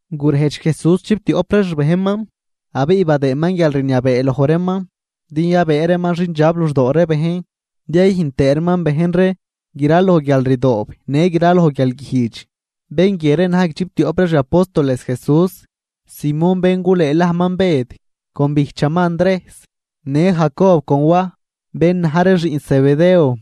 Gurejdx Jesús chiptioꞌp ree xbejnman, abiꞌ badëëman guialrniabee loj reeman din yabëë reeman xindxab luxdoo ree bejn din yayüjn tëë reeman bejn ree graloj guialrdoob në graloj guialguijdx. Bén guie ree na̱j guidxiptioꞌp ree xi apóstoles Jesús: Simón bén gulëëlajman Bëd, con bijchaman Andrejs, në Jacob con Waj, bén na̱j ree xiꞌn Zebedeo.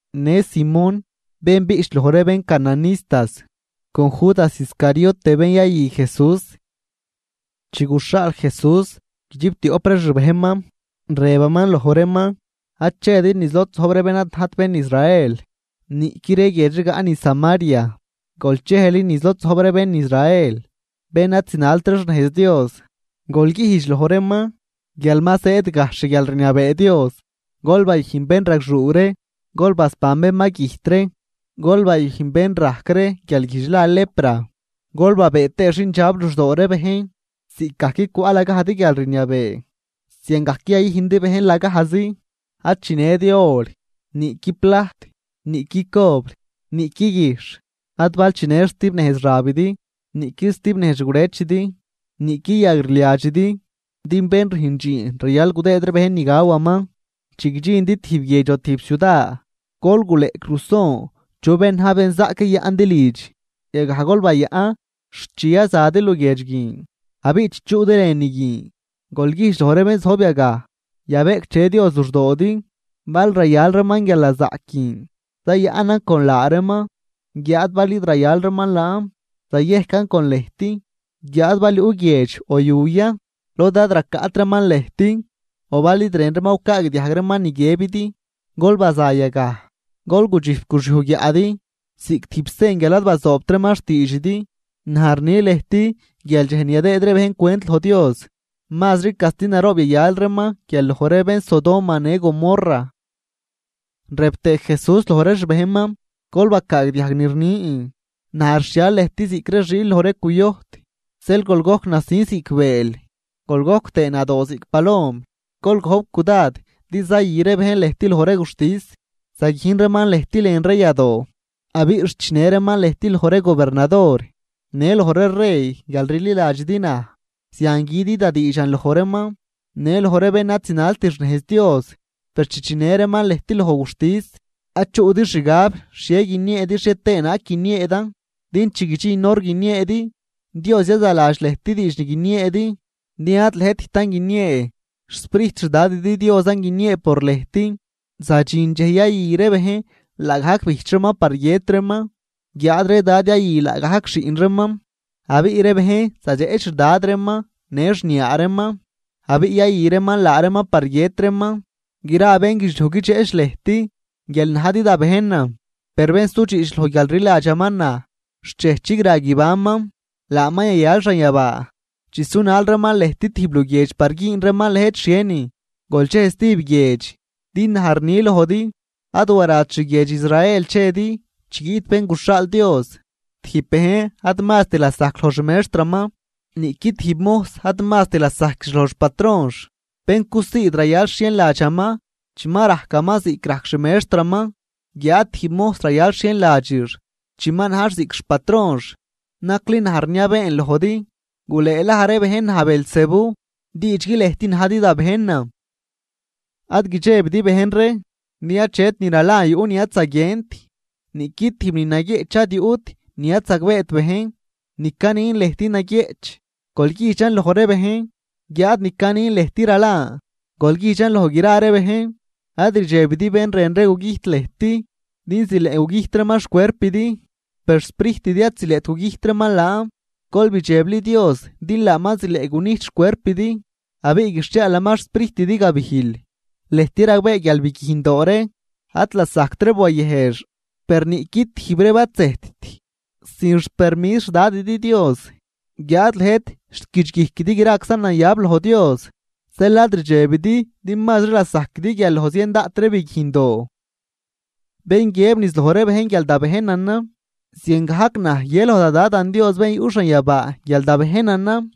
në Simón bén biꞌch loj ree bén Cananistas con Judas Iscariote bén yayü Jesús. Chi guxhaal Jesús guidxiptioꞌp ree xbejnman, rëbaman loj reeman: ―Ad chedi niz lod zojb ree bén ad najt bén Israel, niꞌqui ree guiedx rigaꞌ niz Samaria, gol chejli niz lod zojb ree bén Israel bén ad zinalt ree xnejz Dios. Gol güjdx loj reeman guial ma zëëd gajxh xguialrniabee Dios. Gol bayüjn bénragxuu ree, gol basban bén ma güjt ree, gol bayüjn bén rajc ree guialguijdx la lepra, gol babëë tëë xindxab luxdoo ree bejn. Ziꞌcgajc cwaꞌ lagajdi guialrniabee, ziangajc yayüjndi bejn lagajzi. ’Ad chinëdi or, niꞌqui plajt, niꞌqui cobr, niꞌqui guijxh. Ad bal chinë stib nejz xabidi, niꞌqui stib nejz xgurëchidi, niꞌqui yagrliadxidi, din bén rüjn dxiin rayal gudëëd ree bejn ni gawaman. ’Chi guidxindi tijb guiedx o tijb ciuda, gol guleꞌc ruson chu bén na̱j benzaꞌc yayaꞌndi lidx, yagaj gol bayaꞌn xt chi yazadi luguiedx guin. Abiꞌ chi chuꞌdi lënü guin, gol güjdx loj ree bén zojb yagaj: “Yabeꞌcdxe Dios luxdoodi.” Bal rayal reeman guialnazaꞌc guin, zayaꞌnan con laa reeman guiáad bal id rayal reeman laan zayejcan con lëjt. Guiáad bal yuꞌ guiedx o yu ya lod ad racaꞌt reeman lëjt o bal id rën reeman gucaagdiajg reeman ni guiëbidi, gol baza yagaj, gol gudxijp guxyuj guiaꞌdi ziꞌc tijb sen guial ad bazoobt reeman xtiidxidi. Naj rni lëjt guial dxej ni yadëëd ree bejn cwent loj Dios, mazri casti naroob yayal reeman guial loj ree bén Sodoma në Gomorra. Rëb tëë Jesús loj ree xbejnman: ―Gol bacaagdiajg ni rnin, naj rxhial lëjt ziꞌc ree xiil loj ree cuyojt. Zeel gol gojc nasin ziꞌc bëël, gol gojc tëë nadoo ziꞌc palom. Gol gojp cudad din zayü ree bejn lëjt loj ree guxtis, zaguijn reeman lëjt lën ree yadoo. Abiꞌ xt chinë reeman lëjt loj ree gobernador në loj ree rey guial rliladxidi naj, zian güdi da diidxan loj reeman në loj ree bén ad zinalt xnejz Dios. Per chi chinë reeman lëjt loj guxtis, ad chuꞌdi xgab xhie guinieedi xhie tëë naag guinieedan, din chi guidxin hor guinieedi, Dios yazaladx lëjt diidx ni guinieedi. Din ad lëjttan guiniee, xSprijt xDadidi Diosan guiniee por lëjt. ’Zadxin dxej yayü ree bejn laagajc bijch reeman par guiët reeman. Guiáad ree dad yayü laagajc xiꞌn reeman, abiꞌ ree bejn zadxeꞌch xdad reeman në xniaa reeman abiꞌ yayü reeman laa reeman par guiët reeman. Gra bénguidxliuj guidxeꞌch lëjt guial najdi da bejnan, per bén sudxiꞌch loj guial rliladxaman naj xt dxej chigra guibanman, laaman yayal xanyabaa. Chi sunal reeman lëjt tijb luguiedx par güün reeman lëjt xhienin, gol chej stijb guiedx, din naj rni lojdi, ad warat xguiedx Israel chedi chi guiꞌt Bén guxhaal Dios. ’Tijb bejn ad mast lasajc loj xmextraman, niꞌqui tijb mojs ad mast lasajquix loj xpatronx. Bén cusiid rayal xhienladxaman chi ma rajcaman ziꞌc rajc xmextraman guiáad tijb mojs rayal xhienladxix chi ma najx ziꞌc xpatronx. Nacli naj rniabeen lojdi, gulëëlaj ree bejn naj Beelzebú, diidxgui lëjt najdi da bejnan. ’Ad guidxebidi bejn ree, din achet ni ralan yuꞌ ni ad zaguient, niꞌqui tijb ni naguieꞌch ad yuꞌt ni ad zagbeet bejn. Ni canin lëjt naguieꞌch, gol güjdxan loj ree bejn, guiáad ni canin lëjt ralan, gol güjdxan loj gra ree bejn. Ad rdxebidi bén rën ree gugüjt lëjt. Din zileꞌ gugüjt reeman xcuerpidi, per xsprijtidi ad zileꞌt gugüjt reeman laan. Gol bidxebli Dios din laaman zileꞌ gunijt xcuerpidi abiꞌ guixhiaalaman xsprijtidi gabijl. ’Lëjt ragbee guial biguijndoo ree ad lasajct reeb wayëjx, per niꞌqui tijb reeb ad zëjtt sin xpermis xDadidi Dios. Guiáad lëjt xt guidxguijquidi graczan nayab loj Dios. Zeel ad rdxebidi din mazri lasajquidi guial loj zien daꞌt ree biguijndoo. ’Bén guiëb niz loj ree bejn guial da bejnanan, ziangajc naj guië loj da Dadan Dios bén yuꞌ xanyabaa guial da bejnanan.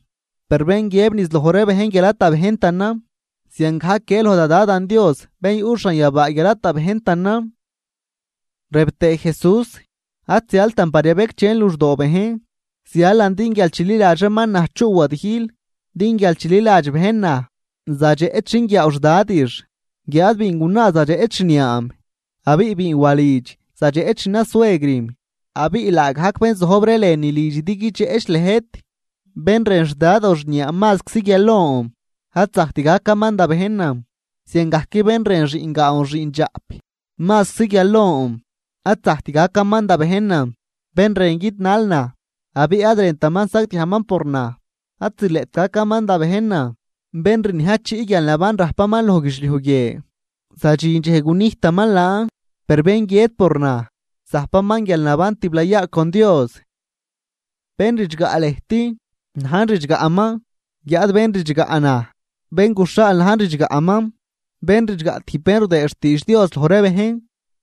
Per bén guiëb niz loj ree bejn guial ad da bejntanan, ziangajc guië loj da Dadan Dios bén yuꞌ xanyabaa guial ad da bejntanan. Rëb tëë Jesús: ―Ad zialtan par yabecdxen luxdoo bejn, zialan din guial chililadx reeman naj chuꞌ wadijl. Din guial chililadx bejn naj, zadxeꞌch xinguiaaw xdadix, guiáad biingunaa zadxeꞌch xniaam, abiꞌ biinwalidx zadxeꞌch xnasuegrim. Abiꞌ laagajc bén zojb ree lënülidxidi guidxeꞌch lëjt. ’Bén rën xdad o xniaa mazczi guial lon, ad zajct gacaman da bejnan. Ziangajc bén rën xiꞌngaan o xiꞌndxaꞌp mazczi guial lon, ad zajct gacaman da bejnan. Bén rën guidnal naj, abiꞌ ad rëntaman sagdiajman por naj, ad zileꞌt gacaman da bejnan. Bén rniajchiꞌ guialnaban rajpaman loj guidxliuj guie, zadxin dxej gunijtaman laan, per bén guiët por naj, zajpaman guialnaban tiblayaa con Dios. ’Bén ridxgaꞌ lëjt, najn ridxgaꞌman, guiáad bén ridxgaꞌ naj, bén guxhaal najn ridxgaꞌman. Bén ridxgaꞌ tijb bén rudëë xtiidx Dios loj ree bejn,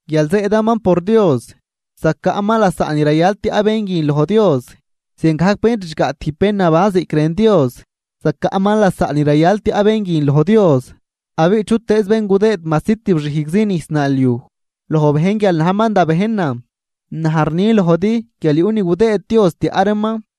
guial zëëdaman por Dios, zacaꞌman lasaꞌ ni rayal tiaꞌ bén guin loj Dios. Ziangajc bén ridxgaꞌ tijb bén naban ziꞌc rën Dios, zacaꞌman lasaꞌ ni rayal tiaꞌ bén guin loj Dios. Abiꞌ chutëëz bén gudëëd majsi tib xijgzi nijs naalyuj loj bejn guial najman da bejnan, naj rni lojdi guial yuꞌ ni gudëëd Dios tiaꞌ reeman.